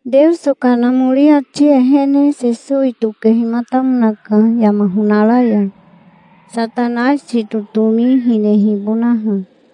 Teoso Kanamori ati ehene Sesowi tokehimatamonaka yama honara ya, Satanaisi totomi hinehibonaha.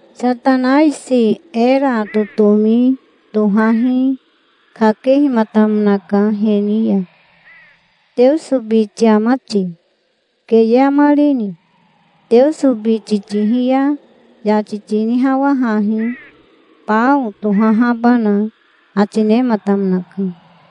Satanaisi era totomi tohahi kakehimatamonaka he ni ya. "Teoso biti ama ti? Keye amarini? Teoso biti tihi ya yati tinihawahahi, bao tohahabana", ati nematamonaka.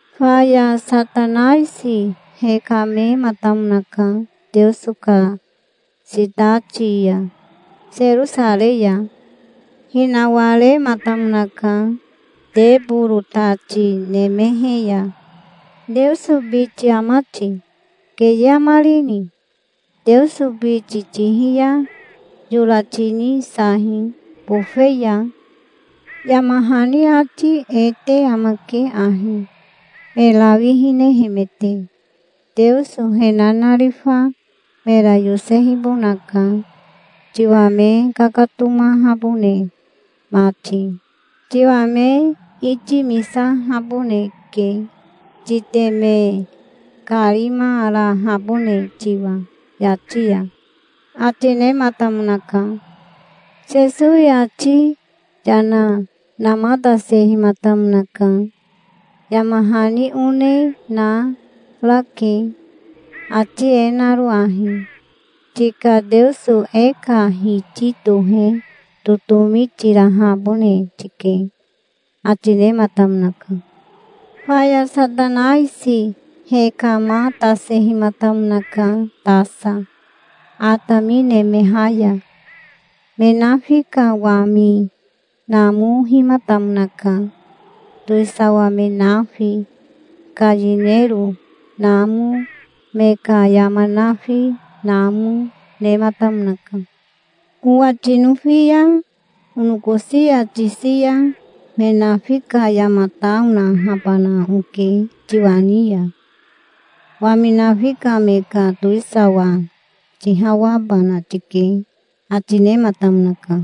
Faya Satanaisi hekamematamonaka Teoso ka sitati ya, Serosarei ya. Hinawarematamonaka teboro tati nemehe ya. "Teoso biti ama ti? Keye amarini? Teoso biti tihi ya yora tinisahi bofe ya. Yama hani ati e te amake ahi, me rawi hinehemete: 'Teoso he nanarifa mera yosehibonaka, tiwa me kakatomahabone mati. Tiwa me itimisahaboneke, titeme karimarahabone tiwa yati ya'", ati nematamonaka. Sesowi ati yana namatasehimatamonaka. "Yama hani one na narake, ati e naro ahi: 'Tika Teoso e ka Hiti tohe totomi tirahabone tike'", ati nematamonaka. Faya Satanaisi hekamatasehimatamonaka tasa, atami nemeha ya. Me nafi ka wami namohimatamonaka. Towisawa me nafi ka yinero namo, me ka yama nafi namo, nematamonaka. "Owa tinofi ya onokosi ya tisi ya me nafi ka yama ta onahabana oke tiwa ni ya. Wami nafi ka me ka towisawa tihawabana tike", ati nematamonaka.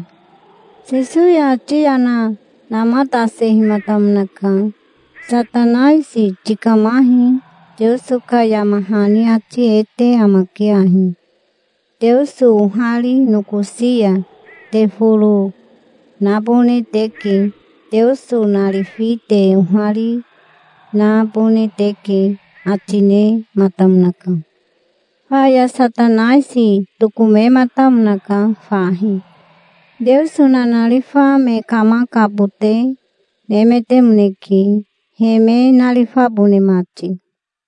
Sesowi ati yana namatasehimatamonaka. "Satanaisi tikamahi. Teoso ka yama hani ati e te amake ahi: 'Teoso ohari nokosi ya te foro nabone teke. Teoso narifi te ohari nabone teke'", ati nematamonaka. Faya Satanaisi tokomematamonaka fahi. Teoso nanarifa me kamakabote nemetemoneke, he me narifabone mati.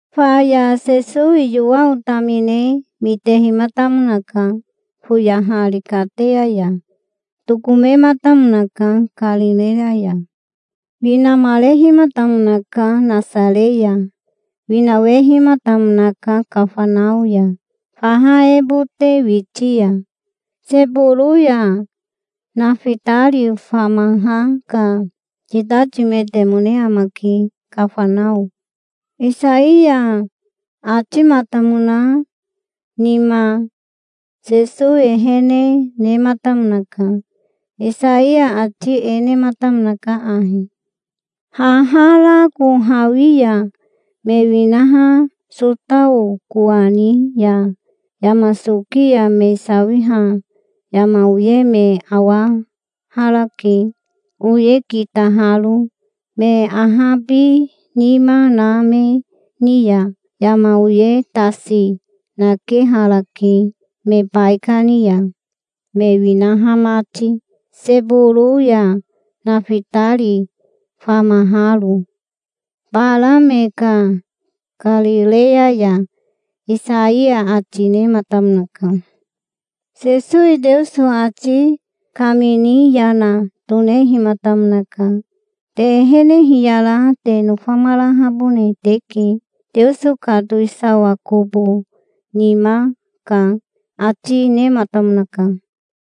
Faya Sesowi Yowao tamine mitehimatamonaka, foyahari kateya ya. Tokomematamonaka Karireya ya. Winamarehimatamonaka Nasare ya. Winawehimatamonaka Kafanao ya, faha ehebote witi ya. Seboro ya Nafitari famaha ka sitatimetemone amake, Kafanao. Isaiya atimatamona nima Sesowi ehene nematamonaka. Isaiya ati e nematamonaka ahi: "Haha rako hawi ya me winaha Sotao kowani ya, yama soki ya me sawiha yama oye me awaharake, oye kitaharo. Me ahabinima na me ni ya yama oye tasi nakeharake me baikani ya, me winaha mati Seboro ya, Nafitari famaharo, bara me ka Karireya ya", Isaiya ati nematamonaka. Sesowi Teoso ati kamini yana tonehimatamonaka. "Te ehene hiyara te nofamarahabone teke. Teoso ka towisawa kobo nima ka", ati nematamonaka.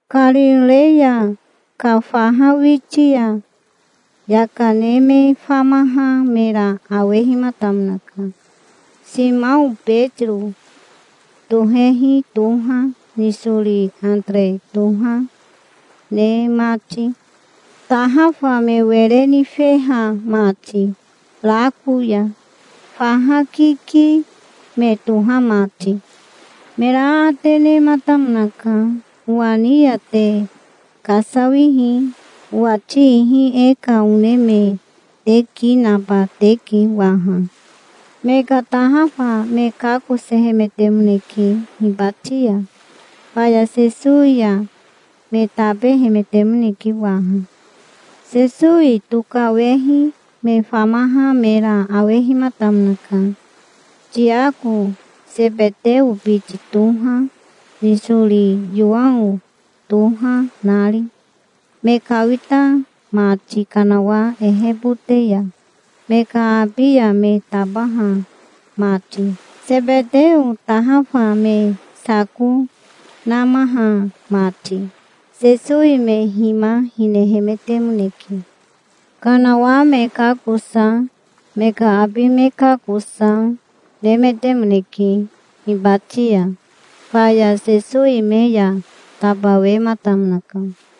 Karireya ka faha witi ya yaka ne me famaha mera awehimatamonaka, Simao Betiro tohehi toha, nisori Atere toha, ne mati, tahafa me were nifeha mati rako ya, faha kiki me toha mati. Mera aate nematamonaka. "Owa ni ya te kasawihi. Owati ihi e ka one me te ki naba teke waha". Me ka tahafa me kakosehemetemoneke hibati ya. Faya Sesowi ya me tabehemetemoneke waha. Sesowi tokawehi me famaha mera awehimatamonaka, Tiako Sebeteo biti toha, nisori Yowao toha nari, me kawita mati kanawa ehebote ya, me ka abi ya me tabaha mati, Sebeteo, tahafa me sako namaha mati. Sesowi me hima hinehemetemoneke. Kanawa me kakosa, me ka abi me kakosa, nemetemoneke hibati ya. Faya Sesowi me ya tabawematamonaka.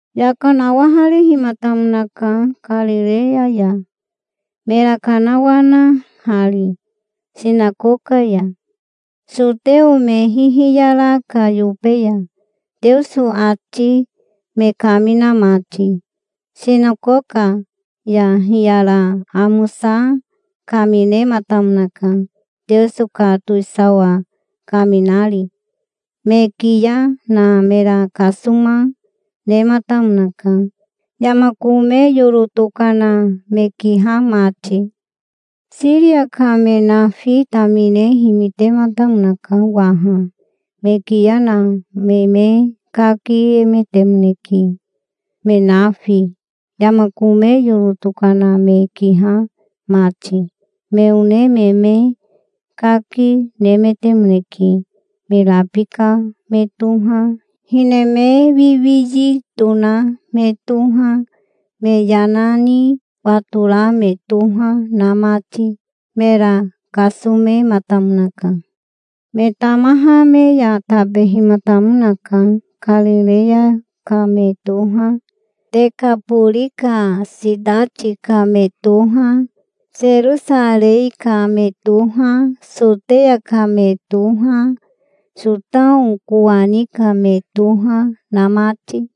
Yaka nawaharehimatamonaka Karireya ya, mera kanawanahari sinakoka ya, soteo me hihiyara ka yobe ya, Teoso ati me kamina mati. Sinakoka ya hiyara amosa kaminematamonaka, Teoso ka towisawa kaminari. Me kiya na mera kasoma nematamonaka, yama kome yoro tokana me kiha mati. Siria ka me nafi tamine himitematamonaka waha. Me kiya na me me kakiemetemoneke me nafi, yama kome yoro tokana me kiha mati. Me one me me kaki nemetemoneke, me rabika me toha, hine me wiwiyi tona me toha, me yana ni watora me toha na mati. Mera kasomematamonaka. Me tamaha me ya tabehimatamonaka. Karireya ka me toha, Tekabori ka sitati ka me toha, Serosarei ka me toha, Soteya ka me toha, Sotao kowani ka me toha, na mati.